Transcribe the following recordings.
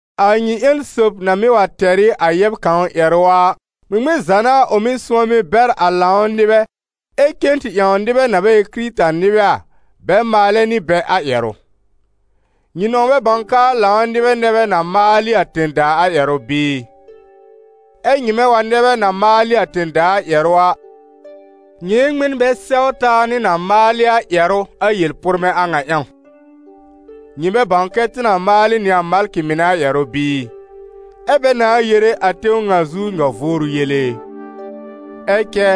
A nyɩ ƴẽn sob na mɩ́ wa tɛr ɩ a yɛb kãw ƴɛrʋ a, ŋmɩŋmɩn za n'a ʋ mɩ́ sʋ̃ɔmɩ bɛr a lãw nɩbɛ, ɛ cen tɩ ƴãw nɩbɛ na bɛ ɩ Kɩrɩta-nɩbɛ a, bɛ maalɛ nɩ bɛ a ƴɛrʋ? Nyɩ nɔ̃w bɛ bãw k'aa lãw nɩbɛ nɛ bɛ na maal ɩ a tẽ-daa a ƴɛrʋ bɩɩ? Ɛ nyɩmɛ wa nɛ bɛ na maal ɩ a tẽ-daa a ƴɛrʋ a, nyɩ ɩ n ŋmɩn bɛ sɛw taa nɩ na maalɩ a ƴɛrʋ a yel-pʋrmɛ̃ a ŋa ƴãw? Nyɩ bɛ bãw kɛ tɩ na maalɩ nɩ a malkɩ mɩnɛ a ƴɛrʋ bɩɩ? Ɛ́ bɛ nãa yere a tẽw ŋa zu nyɔ-vʋʋrʋ yele e! Ɛ cɛ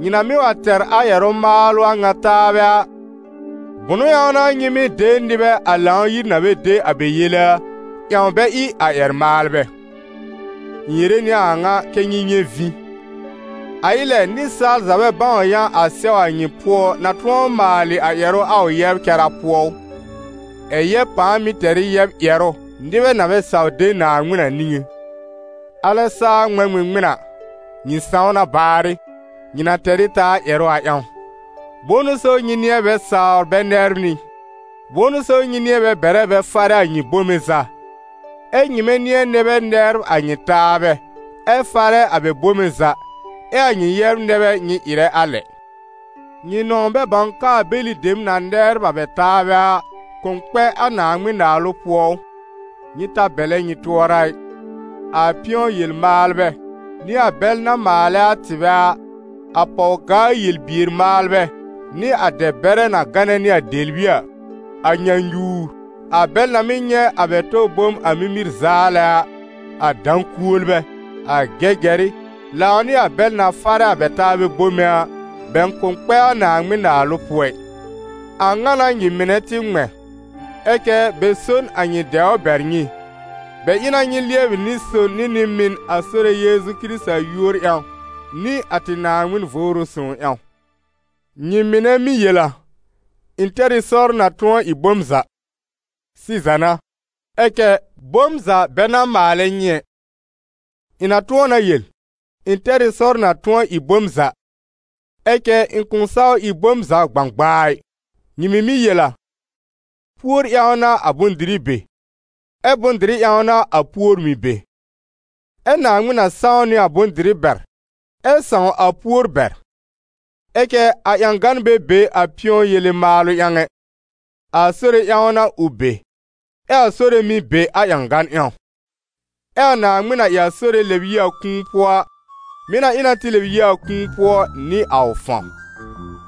nyɩ na mɩ́ wa tɛr a ƴɛrʋ-maalʋ a ŋa taabɛ a, bʋ̃ʋ ƴãw n'a nyɩ mɩ́ de nɩbɛ, a Lãw-yir na bɛ de a bɛ yele a, ƴãw bɛ ɩ a ƴɛr-maalbɛ? Ɩ̃ yere nɩ a a ŋa kɛ́ nyɩ nyɛ̃ vĩ. A ɩ lɛ, nɩsaal za bɛ bãw yã a sɛw a nyɩ pʋɔ na tʋ̃ɔ maalɩ a ƴɛrʋ a ʋ yɛbr cara pʋɔ ʋ? Ɛ̀ yɛb pãa mɩ́ tɛr ɩ yɛb ƴɛrʋ nɩbɛ na bɛ saw de Naaŋmɩn a niŋé! Alɛ saa ŋmɛ̃ ŋmɩŋmɩn a, nyɩ sãw na baarɩ, nyɩ na tɛr ɩ taa ƴɛrʋ a ƴãw. Bʋ̃ʋ n'ʋ so nyɩ nɩ̃ɛ bɛ sawr bɛ nɛbr nyɩ? Bʋ̃ʋ n'ʋ so nyɩ nɩ̃ɛ bɛ bɛrɛ bɛ farɛ a nyɩ bome za? Ɛ́ nyɩmɛ nɩ̃ɛ nɛ bɛ nɛbr a nyɩ taabɛ, ɛ farɛ a bɛ bome za, ɛ a nyɩ yɛbr nɛ bɛ nyɩ ɩrɛ a lɛ. Nyɩ nɔ̃w bɛ bãw k'aa bɛlɩ dem na nɛbr a bɛ taabɛ a, kʋ̃ kpɛ a Naaŋmɩn-Naalʋ pʋɔ ʋ? Nyɩ ta bɛlɛ nyɩ tʋɔra a ɩ! A pɩ̃ɔ-yel-maalbɛ, nɩ a bɛl na maalɛ a tɩbɛ a, a pɔw-gaa yel-bier-maalbɛ, nɩ a dɛ-bɛrɛ na gánɛ nɩ a dɛbli a, a nyãnyuwr, a bɛl na mɩ́ nyɛ̃ a bɛ tɔ bom a mimir zaalɛ a, a dã-kuolbɛ, a gɛgɛrɩ, lãw nɩ a bɛl na farɛ a bɛ taabɛ bome a, bɛ kʋ̃ kpɛ a Naaŋmɩn-Naalʋ pʋɔ ɩ. A ŋa n'a nyɩ mɩnɛ tɩ ŋmɛ̃. Ɛ cɛ bɛ so n a nyɩ dɛwr bɛr nyɩ, bɛ ɩ na nyɩ lɩɛbɩ nɩ-son nɩ nɩ-mɩn a Sore Yeezu Kɩrɩta yúor ƴãw nɩ a tɩ Naaŋmɩn Vʋʋrʋ Sõw ƴãw. Nyɩ mɩnɛ mɩ́ yel a: «Ɩ̃ tɛr ɩ sɔr na tʋ̃ɔ ɩ bom za», sɩza n'a, ɛ cɛ «bom za bɛ n'a maalɛ nyɩ ɛ.» Ɩ̃ na tʋ̃ɔ na yel: «Ɩ̃ tɛr ɩ sɔr na tʋ̃ɔ ɩ bom za», ɛ cɛ ɩ̃ kʋ̃ saw ɩ bom za gbãgbaa ɩ. Nyɩ mɩ̀ mɩ́ yel a: «Púor ƴãw n'a a bʋ̃-dɩrɩ be, ɛ bʋ̃-dɩrɩ ƴãw n'a a púor mɩ̀ be.» Ɛ Naaŋmɩn na sãw nɩ a bʋ̃-dɩrɩ bɛr, ɛ sãw a púor bɛr. Ɛ cɛ a ƴãgan bɛ be a pɩ̃ɔ-yele maalʋ ƴãw ɛ, a Sore ƴãw n'a ʋ be, ɛ a Sore mɩ̀ be a ƴãgan ƴãw. Ɛ a Naaŋmɩn na ɩ a Sore lɛb yi a kũu pʋɔ a, mɩ̀ na ɩ na tɩ lɛb yi a kũu pʋɔ nɩ a ʋ fãw.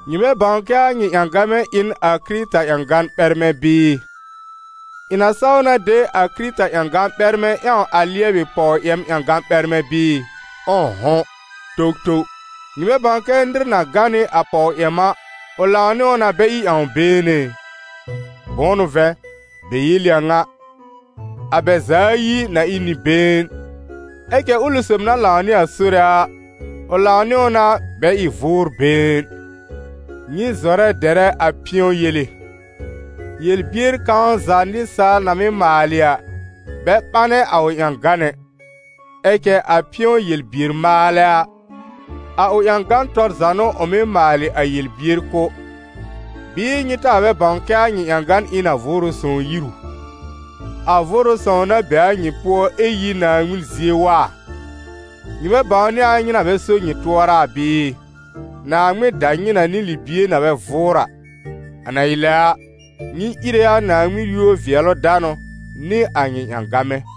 Nyɩ bɛ bãw kɛ a nyɩ ƴãgamɛ ɩ n a Kɩrɩta ƴãgan ɓɛrmɛ bɩɩ? Ɩ̃ na saw na de a Kɩrɩta ƴãgan ɓɛrmɛ ƴãw a lɩɛbɩ pɔw-yɛm ƴãgan ɓɛrmɛ̃ bɩɩ? Ʋ̃ʋ'hʋ̃! Towtow! Nyɩ bɛ bãw kɛ nɩr na gã nɩ a pɔw-yɛm a, ʋ lãw nɩ ʋ na bɛ ɩ ƴãw-been ɛ? Bʋ̃ʋ n'ʋ vɛ̃, bɛ yel ɩ a ŋa: «A bɛ za ayi na ɩ n nɩ-been.» Ɛ cɛ ʋlɩ sob na lãw nɩ a Sore a, ʋ lãw nɩ ʋ na bɛ ɩ vʋʋr-been. Nyɩ zɔrɛ dɛrɛ a pɩ̃ɔ-yele. Yel-bier kãw za nɩsaal na mɩ́ maalɩ a, bɛ ɓanɛ a ʋ ƴãgan ɛ, ɛ cɛ a pɩ̃ɔ-yel-bier-maalɛ a, a ʋ ƴãgan tɔr za n'ʋ ʋ mɩ́ maalɩ a yel-bier kʋ̀. Bɩɩ nyɩ taa bɛ bãw kɛ a nyɩ ƴãgan ɩ n a Vʋʋrʋ Sõw yir u? A Vʋʋrʋ Sõw na be a nyɩ pʋɔ ɛ yi Naaŋmɩn zie wa a? Nyɩ bɛ bãwnɩ a nyɩ na bɛ so nyɩ tʋɔra bɩɩ? Naaŋmɩn da nyɩ na nɩ libie na bɛ vʋʋr a. A na ɩ lɛ a, nyɩ íre a Naaŋmɩn yúor-vɩɛlʋ-danʋ nɩ a nyɩ ƴãgamɛ.